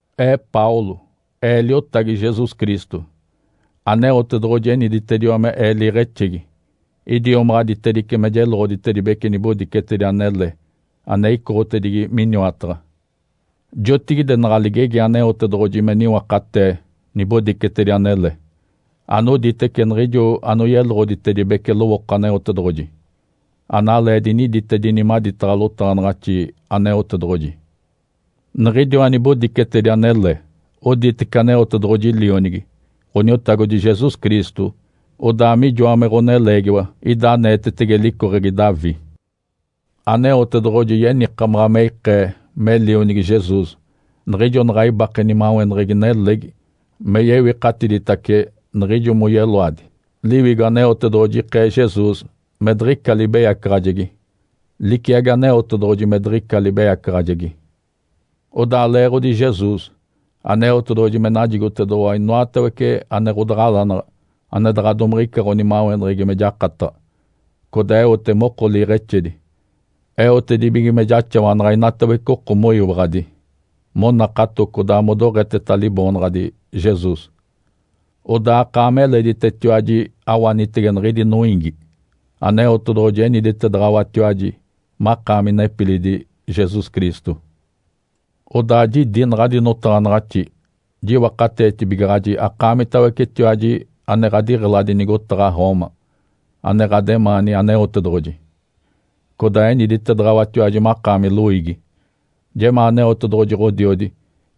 Ee Paulo. Ee liotagi Jesus Cristo. Aneotedoɡ̶oji eniditediwa me ee liiɡ̶exegi, idiomaɡ̶aditedice me jeloɡ̶oditedibece nibodicetedi anele ane icoɡ̶otedigi miniwataɡ̶a. Jotigide naɡ̶a ligegi Aneotedoɡ̶oji me niwakatee nibodicetedi anele, anoditece niɡ̶ijo anoyeloɡ̶oditedibece lowooko Aneotedoɡ̶oji, analee diniditedini maditaɡ̶a lotaɡ̶anaɡ̶axi Aneotedoɡ̶oji. Niɡ̶idiwa nibodicetedi anele oditece Aneotedoɡ̶oji Lionigi, Ǥoniotagodi Jesus Cristo. Odaa mijoa me ɡ̶oneleegiwa, ida aneetetege licoɡ̶egi Davi. Aneotedoɡ̶oji yenikamaɡ̶a me ikee me Lionigi Jesus niɡ̶ijo naɡ̶a ibake nimaweneɡ̶egi nelegi me yewikatiditace niɡ̶ijo moyeloadi. Liwigo Aneotedoɡ̶oji ikee Jesus me diɡ̶ica libeyacaɡ̶ajegi liciagi Aneotedoɡ̶oji me diɡ̶ica libeyacaɡ̶ajegi. Odaa leeɡ̶odi Jesus, Aneotedoɡ̶oji me najigotedoɡ̶owa inoatawece ane ɡ̶odaɡ̶alanaɡ̶a ane daɡ̶a domiɡ̶ica ɡ̶onimaweneɡ̶egi me jakataɡ̶a, codaa eote moko liiɡ̶exedi. Eotedibige me jaxawanaɡ̶a inatawece oko moyiwaɡ̶adi, monakato, codaa modoɡ̶eteta Liboonaɡ̶adi Jesus. Odaa akaami eleditetiwaji awanitege niɡ̶idi noiigi, Aneotedoɡ̶oji eniditedaɡ̶awatiwaji makaami nepilidi Jesus Cristo. Odaa jidi naɡ̶adi notaɡ̶anaɡ̶axi jiwakateetibigaɡ̶aji akaamitawecetiwaji ane ɡ̶adiɡ̶eladi nigotaɡ̶a Roma, ane ɡ̶ademaani Aneotedoɡ̶oji, codaa eniditedaɡ̶awatiwaji makaami loiigi. Jemaa Aneotedoɡ̶oji Ǥodiodi,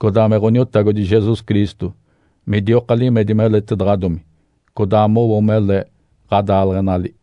codaa me Ǥoniotagodi Jesus Cristo midioka limedi meletaɡ̶adomi, codaa mowo mele ɡ̶adaaleɡ̶enali.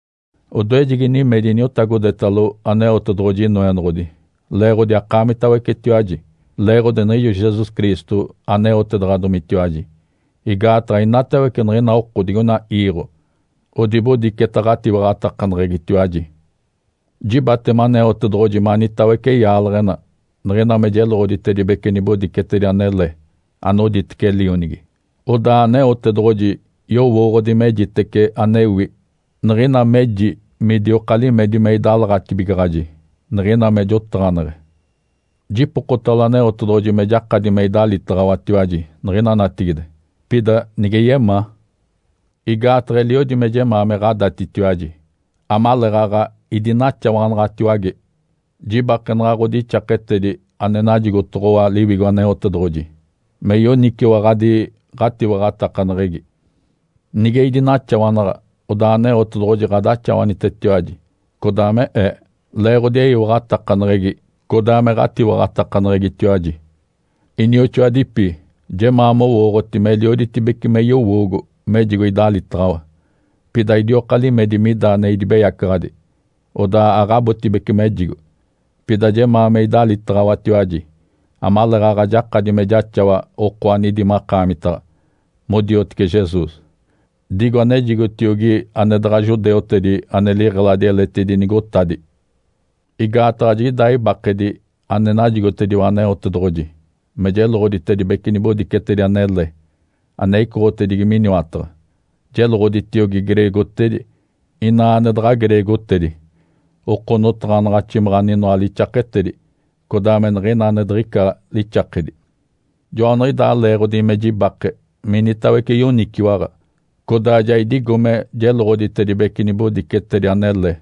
Odoejegi nimedi iniotagodetalo Aneotedoɡ̶oji Inoenoɡ̶odi leeɡ̶odi akaamitawecetiwaji, leeɡ̶odi niɡ̶ijo Jesus Cristo aneotedaɡ̶adomitiwaji. Igaataɡ̶a inatawece niɡ̶ina oko digoina iiɡ̶o odibodiceta ɡ̶atiwaɡ̶atakaneɡ̶egitiwaji. Jibatema Aneotedoɡ̶oji manitawece yaaleɡ̶ena niɡ̶ina me jeloɡ̶oditedibece nibodicetedi anele anoditece Lionigi. Odaa Aneotedoɡ̶oji yowooɡ̶odi mejitece anewi niɡ̶ina meji midioka limedi me idalaɡ̶atibigaɡ̶aji niɡ̶ina me jotaɡ̶aneɡ̶e. Jipokotalo Aneotedoɡ̶oji me jakadi me idalitaɡ̶awatiwaji niɡ̶ina natigide, pida nige yemaa. Igaataɡ̶a eliodi me jemaa me ɡ̶adatitiwaji amaleeɡ̶aɡ̶a idinaxawanaɡ̶atiwage jibakenaɡ̶a ɡ̶odixaketedi ane najigotoɡ̶owa Liwigo Aneotedoɡ̶oji, me yoniciwaɡ̶adi ɡ̶atiwaɡ̶atakaneɡ̶egi. Nige idinaxawanaɡ̶a, odaa Aneotedoɡ̶oji ɡ̶adaxawanitetiwaji, codaa me ee, leeɡ̶odi eyiwaɡ̶atakaneɡ̶egi, codaa me ɡ̶atiwaɡ̶atakaneɡ̶egitiwaji. Inioxoadipi, jemaa mowooɡ̶oti melioditibece me yowoogo mejigo idalitaɡ̶awa, pida idioka limedi mida ane idibeyacaɡ̶adi, odaa aɡ̶abotibece mejigo. Pida jemaa me idalitaɡ̶awatiwaji amaleeɡ̶aɡ̶a jakadi me jaxawa oko anidi makaamitaɡ̶a modiotece Jesus, digo anejigotiogi ane daɡ̶a judeutedi ane liɡ̶eladi eletidi nigotadi. Igaataɡ̶a jiɡ̶idaa ibakedi ane najigotediwa Aneotedoɡ̶oji me jeloɡ̶oditedibece nibodicetedi anele ane icoɡ̶otedigi miniwataɡ̶a, jeloɡ̶oditiogi greegotedi, inaa ane daɡ̶a greegotedi, oko notaɡ̶anaɡ̶aximaɡ̶a aninoa lixaketedi, codaa me niɡ̶ina ane diɡ̶ica lixakedi. Joaniɡ̶idaa leeɡ̶odi me jibake minitawece yoniciwaɡ̶a, codaa ja idigo me jeloɡ̶oditedibece nibodicetedi anele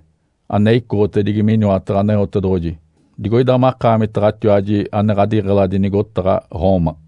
ane icoɡ̶otedigi miniwataɡ̶a Aneotedoɡ̶oji digoida makaamitaɡ̶atiwaji ane ɡ̶adiɡ̶eladi nigotaɡ̶a Roma.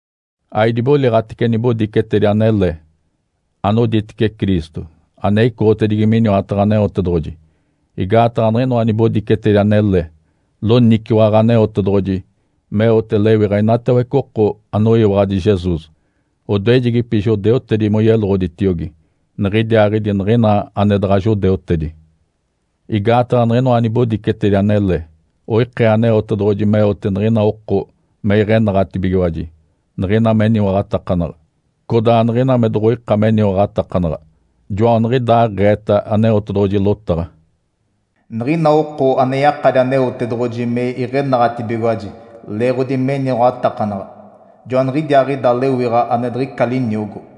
Aidiboliɡ̶atece nibodicetedi anele anoditece Cristo ane icoɡ̶otedigi miniwataɡ̶a Aneotedoɡ̶oji, igaataɡ̶a niɡ̶inoa nibodicetedi anele loniciwaɡ̶a Aneotedoɡ̶oji meote lewiɡ̶a inatawece oko anoyiwaɡ̶adi Jesus, odoejedipi judeutedi moyeloɡ̶oditiogi, niɡ̶idiaaɡ̶idi niɡ̶ina ane daɡ̶a judeutedi. Igaataɡ̶a niɡ̶inoa nibodicetedi anele oikee Aneotedoɡ̶oji meote niɡ̶ina oko me iɡ̶enaɡ̶atibigiwaji niɡ̶ina meniwaɡ̶atakanaɡ̶a, codaa niɡ̶ina me doɡ̶oika meniwaɡ̶atakanaɡ̶a. Joaniɡ̶idaaɡ̶eeta Aneotedoɡ̶oji lotaɡ̶a, “Niɡ̶ina oko ane yakadi Aneotedoɡ̶oji me iɡ̶enaɡ̶atibigiwaji leeɡ̶odi meniwaɡ̶atakanaɡ̶a, joaniɡ̶idiaaɡ̶ida lewiɡ̶a ane diɡ̶ica liniogo.”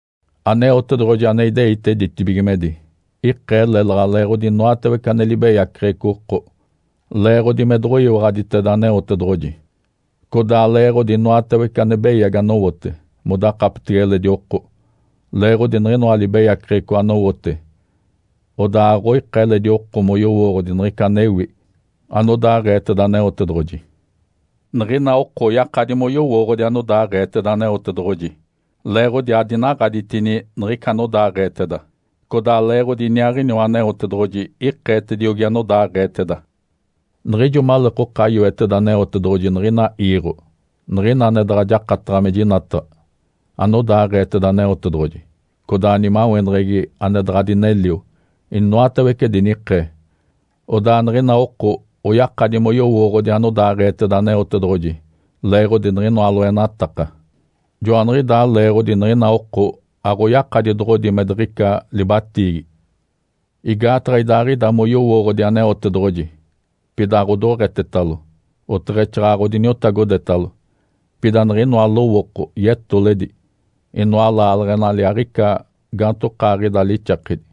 Aneotedoɡ̶oji ane ideite ditibigimedi ikee lélaɡ̶a leeɡ̶odi inoatawece ane libeyaceɡ̶eco oko, leeɡ̶odi me doɡ̶oyiwaɡ̶aditeda Aneotedoɡ̶oji, codaa leeɡ̶odi inoatawece ane beyagi anowote modakapetege eledi oko. Leeɡ̶odi niɡ̶inoa libeyaceɡ̶eco anowote, odaa aɡ̶oika eledi oko moyowooɡ̶odi niɡ̶ica anewi anodaaɡ̶eeteda Aneotedoɡ̶oji. Niɡ̶ina oko oyakadi moyowooɡ̶odi anodaaɡ̶eeteda Aneotedoɡ̶oji, leeɡ̶odi adinaɡ̶aditini niɡ̶ica anodaaɡ̶eeteda, codaa leeɡ̶odi iniaaɡ̶iniwa Aneotedoɡ̶oji ikeetediogi anodaaɡ̶eeteda. Niɡ̶ijo maleekoka yoeteda Aneotedoɡ̶oji niɡ̶ina iiɡ̶o, niɡ̶ina ane daɡ̶a jakataɡ̶a me jinataɡ̶a, anodaaɡ̶eeteda Aneotedoɡ̶oji, codaa nimaweneɡ̶egi ane daɡ̶a dinelio, inoatawece dinikee. Odaa niɡ̶ina oko oyakadi moyowooɡ̶odi anodaaɡ̶eeteda Aneotedoɡ̶oji leeɡ̶odi niɡ̶inoa loenataka. Joaniɡ̶idaa leeɡ̶odi niɡ̶ina oko aɡ̶oyakadi doɡ̶odi me diɡ̶ica libatiigi. Igaataɡ̶a idaaɡ̶ida moyowooɡ̶odi Aneotedoɡ̶oji, pida aɡ̶odoɡ̶etetalo, oteɡ̶exaaɡ̶aɡ̶a odiniotagodetalo. Pida niɡ̶inoa lowooko yetoledi, inoa laaleɡ̶enali aɡ̶ica gaantokaaɡ̶ida lixakedi,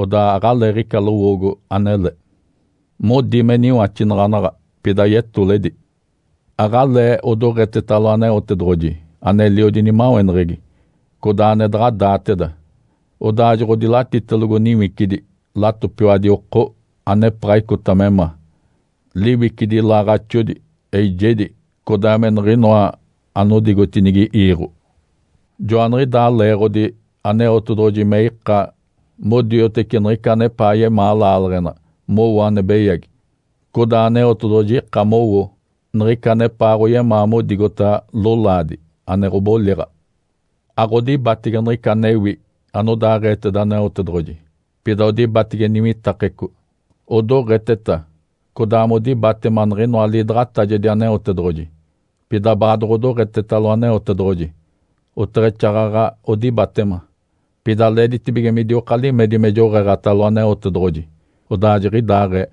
odaa aɡ̶aleeɡ̶ica lowoogo anele. Modi me niwaxinaɡ̶anaɡ̶a, pida yetoledi. Aɡ̶alee odoɡ̶etetalo Aneotedoɡ̶oji aneliodi nimaweneɡ̶egi, codaa ane daɡ̶a daateda. Odaa joɡ̶odilatitelogo niwicidi latopiwadi oko anepaɡ̶a icota me ma, liwicidi ilaaɡ̶axodi, eijedi, codaa me niɡ̶inoa anodigotinigi iiɡ̶o. Joaniɡ̶idaa leeɡ̶odi Aneotedoɡ̶oji me ika modioteci niɡ̶ica anepaa yemaa laaleɡ̶ena mowo ane beyagi, codaa Aneotedoɡ̶oji ika mowo niɡ̶ica anepaaɡ̶oyemaa modigota lolaadi ane ɡ̶oboliɡ̶a. Aɡ̶odibatege niɡ̶ica anewi anodaaɡ̶eeteda Aneotedoɡ̶oji, pida odibatege niwitakeco. Odoɡ̶eteta codaa modibatema niɡ̶inoa liidaɡ̶atajedi Aneotedoɡ̶oji, pida baadoɡ̶odoɡ̶etetalo Aneotedoɡ̶oji, oteɡ̶exaaɡ̶aɡ̶a odibatema. Pida leeditibige midioka limedi me joɡ̶eeɡ̶atalo Aneotedoɡ̶oji. Odaa jiɡ̶idaaɡ̶ee.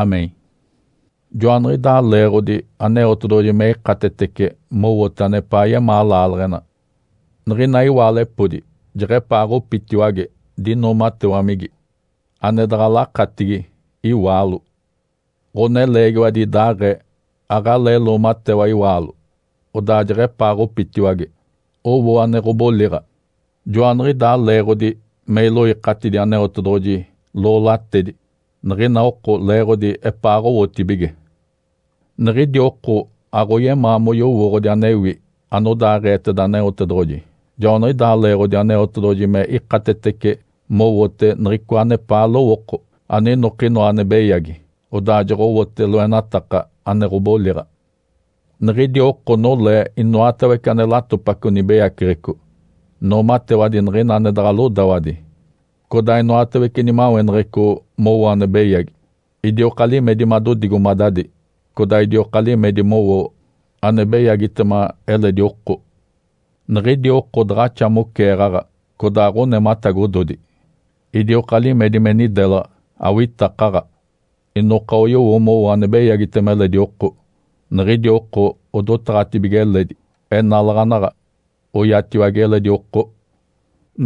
(Amém). Joaniɡ̶idaa leeɡ̶odi Aneotedoɡ̶oji me ikatetece mowote anepaa yemaa laaleɡ̶ena. Niɡ̶ina iwaalepodi jeɡ̶epaaɡ̶opitiwage dinoomatewamigi, ane daɡ̶a lakatigi iwaalo. Ǥoneleegiwadi idaaɡ̶ee, aɡ̶alee loomatewa iwaalo, odaa jeɡ̶epaaɡ̶opitiwage, owo ane ɡ̶oboliɡ̶a. Joaniɡ̶idaa leeɡ̶odi me iloikatidi Aneotedoɡ̶oji loolatedi niɡ̶ina oko leeɡ̶odi epaaɡ̶owotibige. Niɡ̶idi oko aɡ̶oyemaa moyowooɡ̶odi anewi anodaaɡ̶eeteda Aneotedoɡ̶oji, joaniɡ̶idaa leeɡ̶odi Aneotedoɡ̶oji me ikatetece mowote niɡ̶icoa anepaa lowooko aninokinoa ane beyagi, odaa joɡ̶owote loenataka ane ɡ̶oboliɡ̶a. Niɡ̶idi oko nolee inoatawece ane latopaco nibeyaceɡ̶eco; noomatewadi niɡ̶ina ane daɡ̶a lodawadi, codaa inoatawece nimaweneɡ̶eco mowo ane beyagi, idioka limedi madodigomadadi, codaa idioka limedi mowo ane beyagitema eledi oko. Niɡ̶idi oko daɡ̶axa moceeɡ̶aɡ̶a, codaa ɡ̶onematagododi, idioka limedi me nidelaɡ̶a, awitakaɡ̶a, inoka oyowo mowo ane beyagitema eledi oko. Niɡ̶idi oko odotaɡ̶atibige eledi, enalaɡ̶anaɡ̶a oiatiwage eledi oko.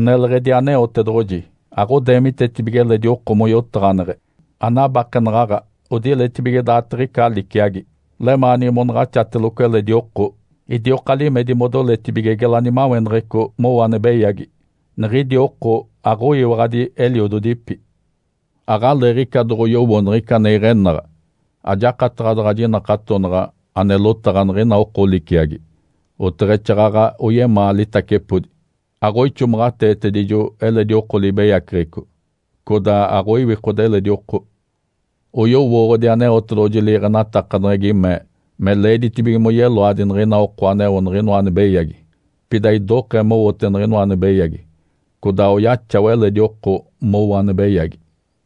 Neleɡ̶edi Aneotedoɡ̶oji, aɡ̶odeemitetibige eledi oko moyotaɡ̶aneɡ̶e. Anabakenaɡ̶aɡ̶a, odiletibige me daaditiɡ̶ica liciagi, lemaanigi monaɡ̶axateloco eledi oko. Idioka limedi modoletibige geladi nimaweneɡ̶eco mowo ane beyagi. Niɡ̶idi oko aɡ̶oyiwaɡ̶adi eliododipi. Aɡ̶aleeɡ̶ica doɡ̶oyowo niɡ̶ica ane iɡ̶enaɡ̶a. Ajakataɡ̶a daɡ̶a jinakatonaɡ̶a ane lotaɡ̶a niɡ̶ina oko liciagi. Oteɡ̶exaaɡ̶aɡ̶a oyemaa litacepodi. Aɡ̶oixomaɡ̶ateetedijo eledi oko libeyaceɡ̶eco, codaa aɡ̶oiwikode eledi oko. Oyowooɡ̶odi Aneotedoɡ̶oji liiɡ̶enatakaneɡ̶egi mee me leeditibige moyeloadi niɡ̶ina oko aneo niɡ̶inoa ane beyagi. Pida idokee mowote niɡ̶inoa ane beyagi, codaa oyaxawa eledi oko mowo ane beyagi.